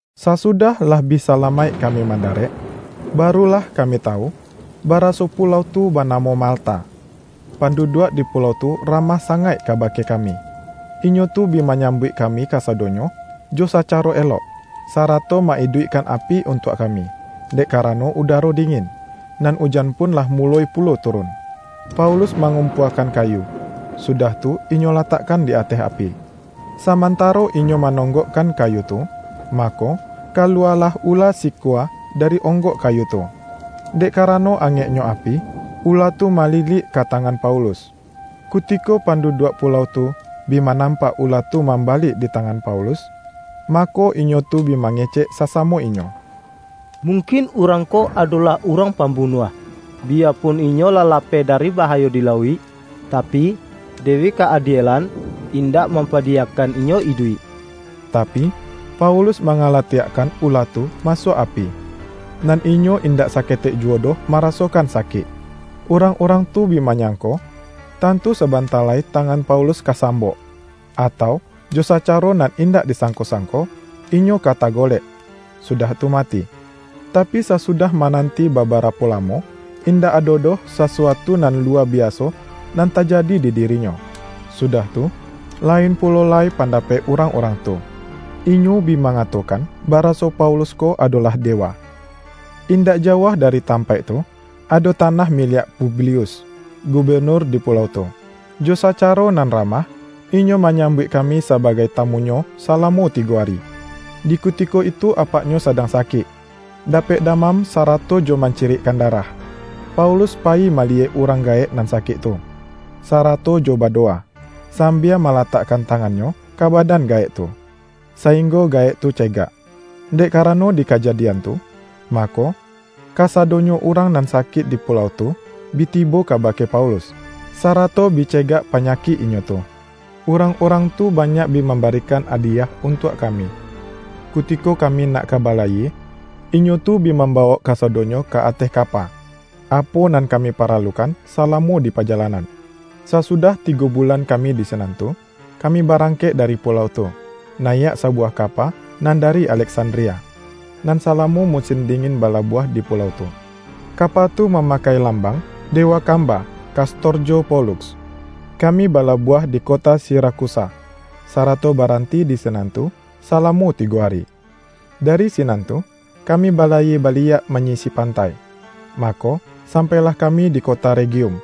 Sasudah lah bi salamaik kami mandarek, baru lah kami tawu, baraso pulau tu banamo Malta. Panduduak di pulau tu ramah sangaik kabake kami. Inyo tu bi manyambuik kami kasadonyo jo sacaro elok, sarato ma-iduikkan api untuak kami, dek karano udaro dingin, nan ujan pun lah muloi pulo turun. Paulus mangumpuakan kayu, sudah tu inyo latakkan di ateh api. Samantaro inyo manonggokkan kayu tu, mako, kaluwalah ula sikua dari onggok kayu tu, dek karano angeknyo api, ula tu malilik ka tangan Paulus. Kutiko panduduak pulau tu, bi manampak ula tu mambalik di tangan Paulus, mako, inyo tu bi mangecek sasamo inyo,”Mungkin urang ko adolah urang pambunuah, biya pun inyo lah lapeh dari bahayo di lauik, tapi, Dewi Ka-adielan indak mampadiyakan inyo iduik.” Tapi, Paulus mangalatiakkan ula tu masuak api, nan inyo indak saketek juwo doh marasokan sakik. Urang-urang tu bi manyangko, tantu sabanta lai tangan Paulus ka sambok, atau jo sacaro nan indak disangko-sangko inyo ka tagolek, sudah tu mati. Tapi, sasudah mananti babarapo lamo, indak ado doh sasuatu nan luwa biaso nan tajadi di dirinyo, sudah tu, lain pulo lai pandapek urang-urang tu, inyo bi mangatokan baraso Paulus ko adolah dewa. Indak jauah dari tampaik tu, ado tanah miliak Publius, gubenur di pulau tu. Jo sacaro nan ramah, inyo manyambuik kami sabagai tamunyo salamo tigo ari. Di kutiko itu apaknyo sadang sakik, dapek damam sarato jo mancirikkan darah. Paulus payi maliyek urang gaek nan sakik tu, sarato jo badowa, sambia malatakkan tangannyo ka badan gaek tu, sainggo gaek tu cegak. Dek karano di kajadian tu, mako, kasadonyo urang nan sakik di pulau tu bi tibo kabake Paulus, sarato bi cegak panyakik inyo tu. Urang-urang tu banyak bi mambarikan adiyah untuak kami, kutiko kami nak ka balayie, inyo tu bi mambawok kasadonyo ka ateh kapa, apo nan kami paralukan salamo dipajalanan. Sasudah tigo bulan kami di sinan tu, kami barangkek dari pulau tu, nayiak sabuwah kapa nan dari Aleksandria, nan salamo musin dingin balabuah di pulau tu. Kapa tu mamakai lambang”Dewa Kamba, Kastorjo Poluks”. Kami balabuah di kota Sirakusa, sarato baranti di sinan tu salamo tigo ari. Dari sinan tu, kami balayie baliak manyisi pantai, mako sampailah kami di kota Regium.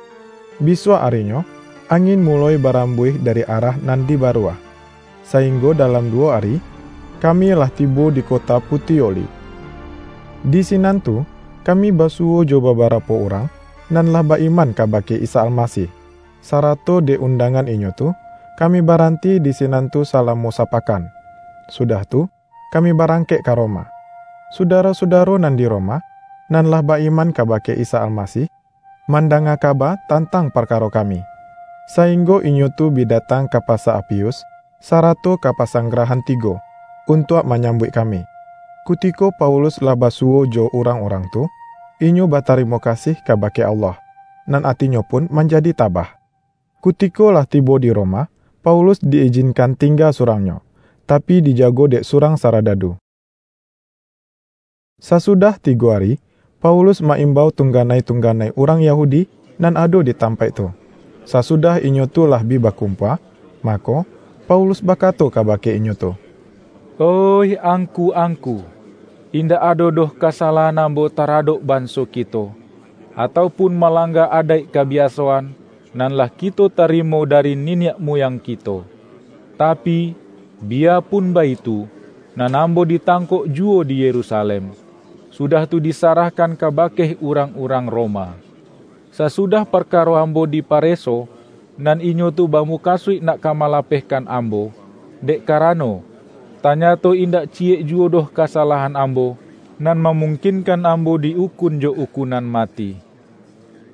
Bisuak arinyo angin muloi barambuih dari arah nan di Baruah, sainggo dalam duwo ari, kami lah tibo di kota Putioli. Di sinan tu, kami basuwo jo babarapo urang, nan lah ba-iman kabake Isa Almasih, sarato dek undangan inyo tu, kami baranti di sinan tu salamo sapakan. Sudah tu, kami barangkek ka Roma. Sudaro-sudaro nan di Roma, nan lah ba-iman kabake Isa Almasih, mandanga kaba tantang parkaro kami, sainggo inyo tu bi datang ka Pasa Apius, sarato ka Pasanggrahan Tigo, untuak manyambuik kami. Kutiko Paulus lah basuwo jo urang-urang tu, inyo batarimo kasih kabake Allah, nan atinyo pun manjadi tabah. Kutiko lah tibo di Roma, Paulus di-ijinkan tingga surangnyo, tapi dijago dek surang saradadu. Sasudah tigo ari, Paulus ma-imbau tunganai-tunganai urang Yahudi nan ado di tampaik tu. Sasudah inyo tu lah bi bakumpua, mako, Paulus bakato kabake inyo tu,”Oih angku-angku! Indak ado doh kasalahan ambo taradok banso kito, atau pun malangga adaik kabiasoan, nan lah kito tarimo dari niniak muyang kito. Tapi, biyapun baitu, nan ambo ditangkok juwo di Yerusalem, sudah tu disarahkan kabake urang-urang Roma. Sasudah parkaro ambo dipareso, nan inyo tu bamukasuik nak ka malapehkan ambo, dek karano, tanyato indak ciyekjuwo doh kasalahan ambo, nan mamungkinkan ambo di-ukun jo ukunan mati.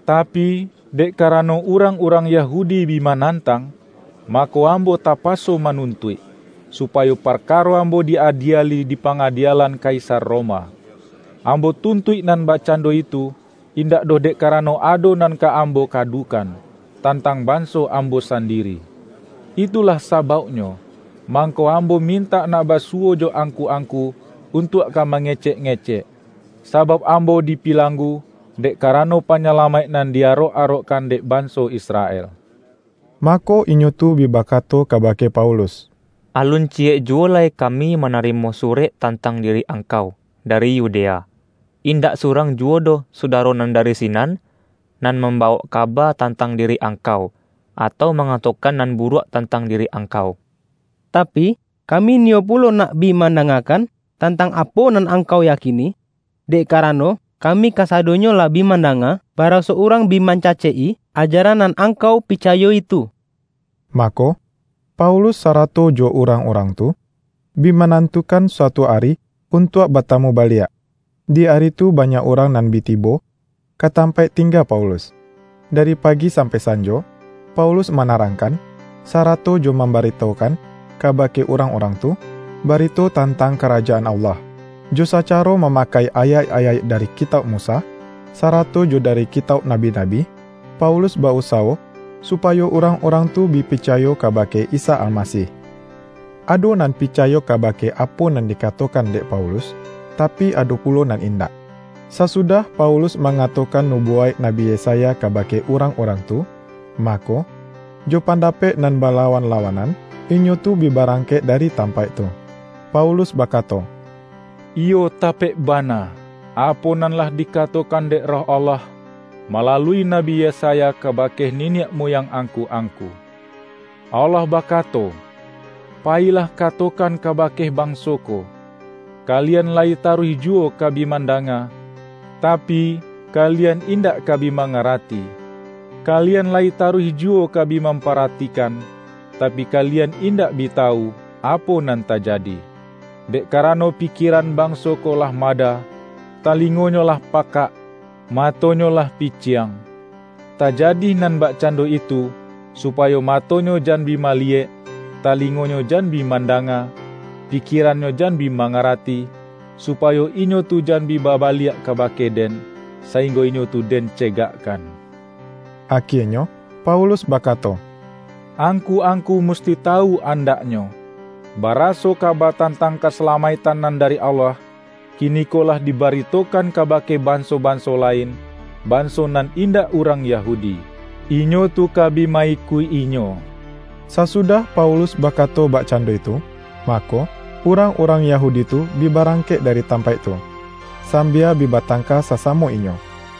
Tapi, dek karano urang-urang Yahudi bi manantang, mako, ambo tapaso manuntuik, supayo parkaro ambo di-adieli dipangadielan Kaisar Roma. Ambo tuntuik nan bakcando itu, indak doh dek karano ado nan ka ambo kadukan, tantang banso ambo sandiri. Itulah sabauknyo, mangko ambo mintak nak basuwo jo angku-angku untuak ka mangecek-ngecek; sabauk ambo di pilanggu, dek karano Panyalamaik nan di arok-arokkan dek banso Israel.” Mako, inyo tu bi bakato kabake Paulus,”Alun ciyek juwo lai kami manarimo surek tantang diri angkau, dari Yudea. Indak surang juwo doh sudaro nan dari sinan, nan mambawok kaba tantang diri angkau, atau mangatokan nan buruak tantang diri angkau. Tapi, kami niyo pulo nak bi mandangakan, tantang apo nan angkau yakini, dek karano kami kasadonyo lah bi mandanga, baraso urang bi mancacek-i ajaran nan angkau picayo-i tu.” Mako, Paulus sarato jo urang-urang tu, bi manantukan suatu ari untuak batamu baliak. Di ari tu banyak urang nan bi tibo ka tampaik tingga Paulus. Dari pagi sampai sanjo, Paulus manarangkan, sarato jo mambaritokan kabake urang-urang tu, barito tantang Karajaan Allah. Jo sacaro mamakai ayaik-ayaik dari Kitauk Musa, sarato jo dari Kitauk Nabi-nabi, Paulus ba-usawo supayo urang-urang tu bi picayo kabake Isa Almasih. Ado nan picayo kabake apo nan dikatokan dek Paulus, tapi, ado pulo nan indak. Sasudah Paulus mangatokan nubuwaik Nabi Yesaya kabake urang-urang tu, mako, jo pandapek nan balawan-lawanan, inyo tu bi barangkek dari tampaik tu, Paulus bakato,”Iyo tapek bana, apo nan lah dikatokan dek Roh Allah, malalui Nabi Yesaya kabake niniak muyang angku-angku! Allah bakato, ’Payilah katokan kabake banso ko: Kalian layi taruih juwo ka bi mandanga, tapi, kalian indak ka bi mangarati; kalian layi taruih juwo ka bi mamparatikan, tapi, kalian indak bi tawu, apo nan tajadi. Dek karano pikieran banso ko lah mada, talingonyo lah pakak, matonyo lah piciang. Tajadi nan bakcando itu, supayo matonyo jan bi maliyek, talingonyo jan bi mandanga, pikierannyo jan bi mangarati, supayo inyo tu jan bi babaliak kabake-Den, sainggo inyo tu Den cegakkan.’” Akienyo Paulus bakato,”Angku-angku musti tawu andaknyo, baraso kaba tantang kasalamaiktan nan dari Allah, kiniko lah dibaritokan kabake banso-banso lain, banso nan indak urang Yahudi. Inyo tu ka bi ma-ikuik-inyo!” Sasudah Paulus bakato bakcando itu, mako, urang-urang Yahudi tu bi barangkek dari tampaik tu, sambia bi batangka sasamo inyo.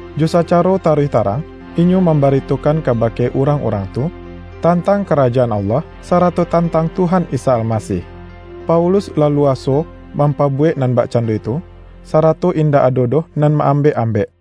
Jo sacaro taruih tarang, inyo mambaritokan kabake urang-urang tu, tantang Karajaan Allah, sarato tantang Tuhan Isa Almasih. Paulus laluaso mampabuwek nan bakcando itu, sarato indak ado doh nan ma-ambek-ambek.